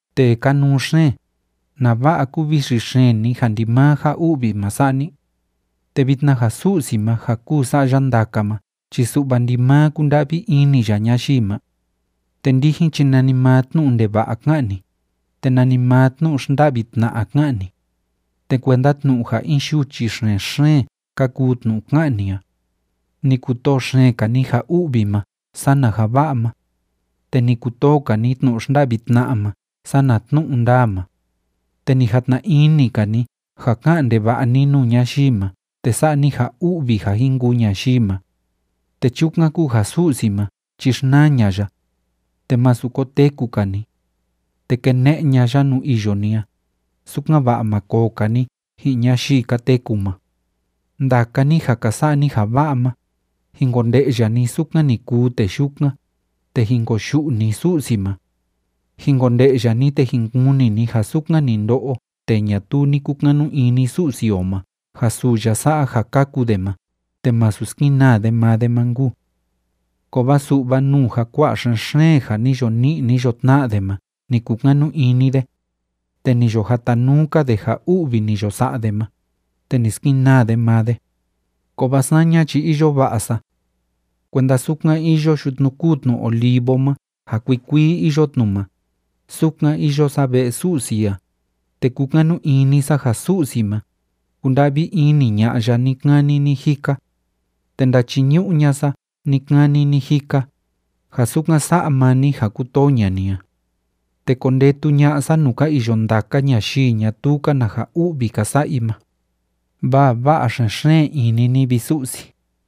Tee kanuu xeen, ¿nava'a kúvixi xeen ni, ja ndimaa ja u'vi ma sa'a ni? Te vitna ja Su'si ma ja kúu sa'a ya ndaka ma chi su'va ndimaa kúnda'vi ini ya ñayii ma. Te ndijin chi nanimaa tnu'u ndeva'a ká'an ni, te nanimaa tnu'u xnda'vi tna'a ká'an ni. Te kuenda tnu'u ja in yuchi xen‑xeen ka kuu tnu'u ká'an ni a. Ni kutoo xeen‑ka ni ja u'vi ma sana ja va'a ma. Te ni kutoo‑ka ni tnu'u xnda'vi tna'a ma sana tnu'u ndaa ma. Te ni jatna ini‑ka ni ja ka'an ndeva'a ni nuu ñayii ma te sa'a ni ja u'vi ja jin kuu ñayii ma. Te chukan kúu ja Su'si ma chi xnaa ña'a ya, te masu koteku‑ka ni, te kene'e ña'a ya nuu iyo ni a, sukan‑va'a ma koo‑ka ni ji'in ñayii ka teku ma. Ndaka ni ja ka sa'a ni ja va'a ma, jin konde'ya ni sukan ni kuu tee yukan, te jin koyu'u ni Su'si ma. Jin konde'ya ni, te jin kuni ni ja sukan ni ndo'o tee ñatuu ni kukanu ini Su'si o ma ja suu ya sa'a ja kaku de ma te masu skenaa de maa de ma nkuu. Kovaa su'va nuu ja kua'a xen‑xeen ja ni yo ni'i ni yo tna'a de ma ni kukanu ini de, te ni yo jatanuu‑ka de ja u'vi ni yo sa'a de ma, te ni skenaa de maa de. Kovaa saña chi iyo va'a sa. Kuenda sukan iyo yutnu kúu tnu olivo ma ja kuikuii iyo tnu ma, sukan iyo sa ve'e Su'si a, te kúkanu ini sa ja Su'si ma, kúnda'vi ini ña'a ya ni‑kani ni‑jika. Te ndachiñu'u ña'a sa ni‑kani ni‑jika, ja sukan sa'a maa ni ja kútoo ña'a ni a. Te kondetu ña'a sa nuu ka iyo ndaka ñayii ñatuu‑ka na ja u'vi ka sa'a i ma, vaa va'a xen‑xeen ini ni, vi Su'si.